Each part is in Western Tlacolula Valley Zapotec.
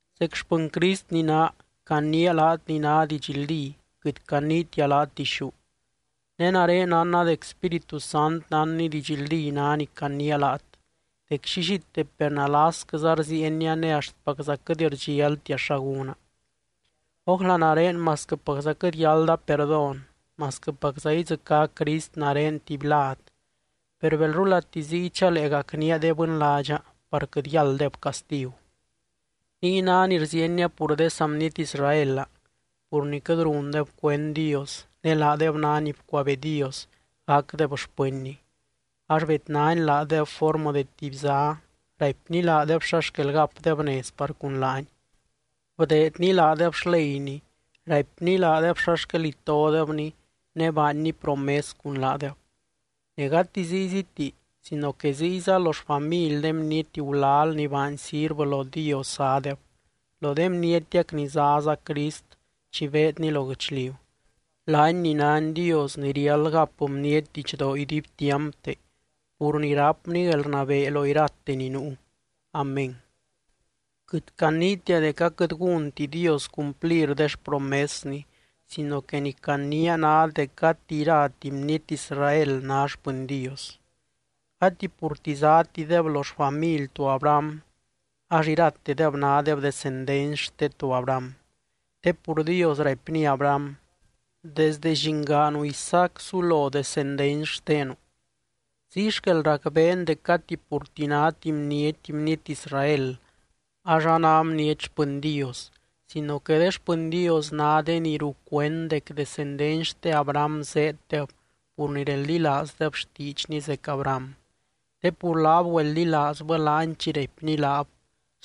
Zec xpɨny Crist ni naa, caniia laat ni ná didxldí quɨt caniitia laat dixú. Ne nare nánna dec Spíritu Sant nánny didxldí ná ni caniia laat dec llillite per nalasquɨza rziienia ne axtpacza quɨt rdxialtia xa gúna. Ójla nare masquɨpacza quɨt yálda perdón, masquɨpacza idzɨcá Crist nare tuby lad, per belrulati ziy chalee gacnía de bɨnládxa par quɨt yálddeb castigu. Niy ná ni rziienia pur de saa bniety Israelaa pur ni quɨt rundeb cuend Dios ne laadeb ná ni bcuabee Dios gacdeb xpɨnny ax bednany laadeb formɨ de tuby zá, raipny laadeb xa xquel gapdeb nez par cun laany, bdeedny laadeb xleyny, raipny laadeb xa xquel itodebny ne baanny promes cun laadeb. Ne gati zíyziti sino que ziyza lo xfamily de bniety gulal ni baany sirvɨ lo Dios zádeb, lo de bnietiac ni záza Crist chi beedny lo guɨchliu, laany ni nány Dios ni riáld gap bniety didxdoo iduibtiampte pur ni rápny guelrnabee lo irate ni nuu. Amén. Quɨt caniitia dec aquɨt gúnti Dios cumplir de xpromesny, sino que ni caniia ná dec gati irati bniety Israel ná xpɨny Dios. Gati purti zátideb lo xfamily to Abraham ax iratedeb nádeb descendency xte to Abraham, te pur Dios raipny Abraham: “Desdɨ llingaanu Isaac sulo descendency xtenu.” Ziy xquel racbeen dec gati purti náti bniety, bniety Israel, ax a ná bniety xpɨny Dios sino que de xpɨny Dios ná de ni rucuend dec descendency xte Abraham zéeddeb pur ni reldilaazdeb xtiidxny zec Abraham. Te pur laab güeldilaazbɨ laany chi raipny laab: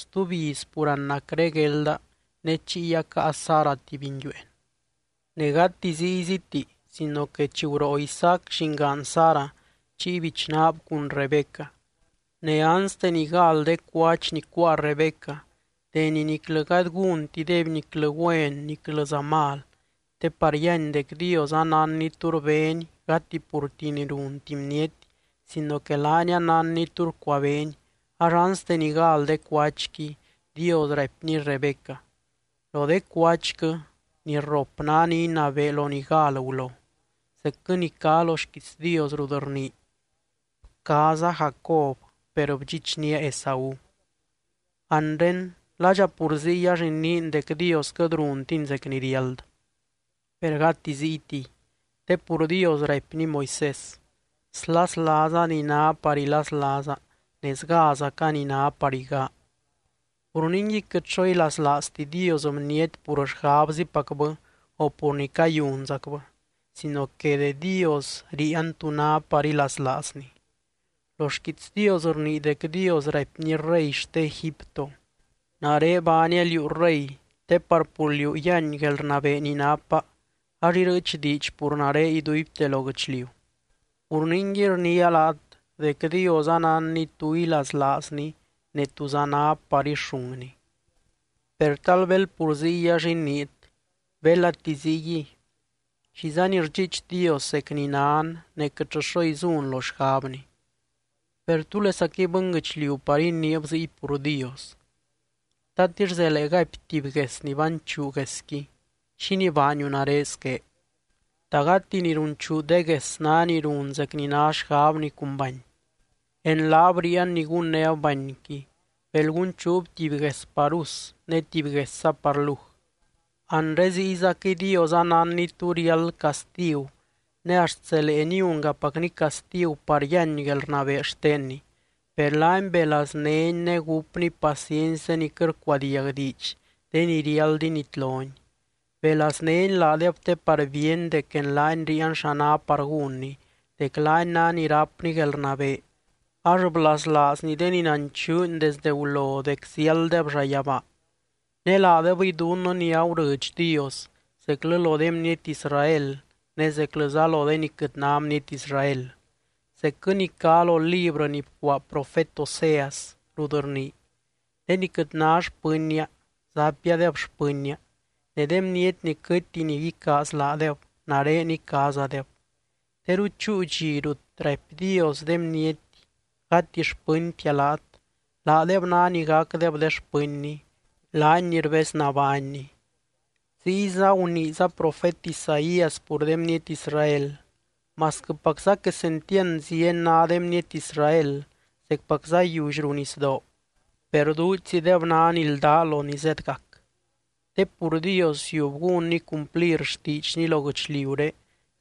“Stuby iz pur anacre guelda ne chiy acaa Sara tuby nguiueen.” Ne gati zíyziti sino que chi guroo Isaac llingaan Sara chiy bichnaab cun Rebeca. Ne anste ni gal de cuach ni cuáa Rebeca (deni niclɨ gady gúntideby niclɨ güen niclɨza mal, te par yíany dec Dios anánny tú rbény gati purti ni runti bniety sino que laany anánny tú rcuabeeny ax anste ni gal de cuachqui), Dios raipny Rebeca: “Lo de cuachquɨ, ni rrop ná ni inabee lo ni gal gulo.” Zecquɨ ni cá lo xquiits Dios rut rnii: “Bcaaza Jacob per bdxichnía Esaú.” Anre, ¿ladxa pur ziy ax iniin dec Dios quɨt runtiny zec ni riáld? ¡Per gati ziytiy! Te pur Dios raipny Moisés: “Slaslaaza ni ná par ilaslaaza ne sgázaca ni ná par igaa.” Pur ningui quɨt xo ilaslaazti Dios bniety pur xgabzipacbɨ o pur ni cayunzacbɨ sino que de Dios ríian tú ná par ilaslaazny. Lo xquiits Dios rnii dec Dios raipny rey xte Egipto: “Nare baania liú rey te par pur liú yíany guelrnabee ni napa ax irɨɨch diidx pur nare iduibte lo guɨchliu.” Pur ningui rniia laat dec Dios anánny tú ilaslaazny ne túza ná par ixúngny. Per tal bel pur ziy ax iniit: “Belati ziyguiy, ¿xizani rdxiich Dios zec ni nan ne quɨtllɨ xo izun lo xgabny?” Per, ¿túlesaquɨy bɨnguɨchliu par iniib ziy pur Dios? ¿Tatix zelee gaipy tuby gues ni banchuu guesqui: “Xínii baaniu nare squé?” ¿Ta gati ni runchuu de gues ná ni run zec ni ná xgabni cun bany? En laab ríian ni gunnéb banyqui, bel gunchuub tuby gues par us ne tuby guesza par luj. Anre ziyzaquɨy Dios anánny tú riáld castigu ne axt zelee niungapacny castigu par yíany guelrnabee xtenny. Per laany belaaznény ne gúpny paciency de ni quɨt rcuadiag diidx, de ni riáld initlony. Belaaznény laadeb te par bíeny dec en laany ríian xa ná par gúnny, dec laany ná ni rápny guelrnabee ax blaslaazny de ni nanchuuny desde gulo dec ziálddeb llayabaa. Ne laadebɨy dunnɨ ni agurɨdx Dios zeclɨ lo de bniety Israel ne zeclɨza lo de ni quɨt ná bniety Israel. Zecquɨ ni cá lo librɨ ni bcuaa profet Oseas, rut rnii: De ni quɨt ná xpɨnnia, zapiadeb xpɨnnia, ne de bniety ni quɨtti ni icaaz laadeb, nare icaazadeb. Teru chúu dxi rut raipy Dios de bniety: “Gati xpɨntia laat”, laadeb ná ni gacdeb de xpɨnny, laany ni rbez nabánny. Ziyza guniiza profet Isaías pur de bniety Israel: “Masquɨpacza quesentiand zieny ná de bniety Israel zecpacza yiully ruu nisdoo, per duudxzideb ná ni ldá lo ni zedgac. Te pur Dios ziub gúnny cumplir xtiidxny lo guɨchliuré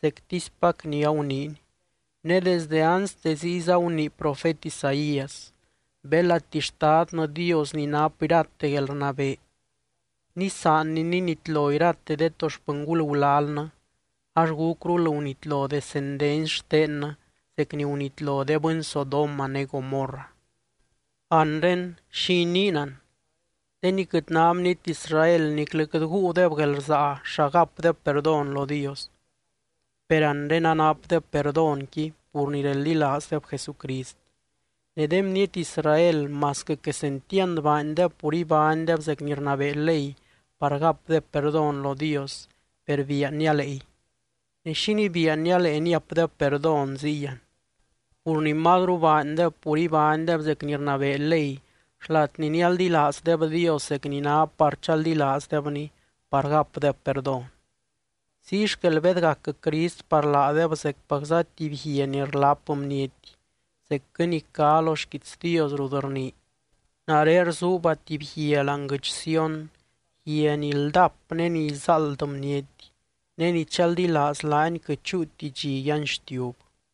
zectispac ni aguniiny.” Ne desdɨ anste ziyza gunii profet Isaías: Belati Xtadnɨ Dios ni nap irate guelrnabee nisaanny ninitlo irate de to xpɨngul gulalnɨ, ax gúcrul gunitlo descendency xtennɨ zec ni gunitlo de bɨny Sodoma ne Gomorra. Anre, ¿xi iniin an? De ni quɨt ná bniety Israel niclɨ quɨt guudeb guelrsaa xa gapdeb perdón lo Dios, per anre anapdeb perdónqui pur ni reldilaazdeb Jesucrist. Ne de bniety Israel masquɨ quesentiand baandeb pur ibánydeb zec ni rnabee ley par gapdeb perdón lo Dios, per bian nialeey. Ne, ¿xínii bian nialee niapdeb perdón ziy an? Pur ni mazru baandeb pur ibánydeb zec ni rnabee ley xlat ni nialdilaazdeb Dios zec ni ná par chaldilaazdebny par gapdeb perdón. Ziy xquel bedgac Crist par laadeb zecpacza tuby “guia ni rlap bniety”, zecquɨ ni cá lo xquiits Dios rut rnii: Nare rzuuba tuby guia láani guɨdx Sión, guia ni ldap ne ni izáald bniety. Ne ni chaldilaaz laany quɨt chúuti dxi yanxtiub.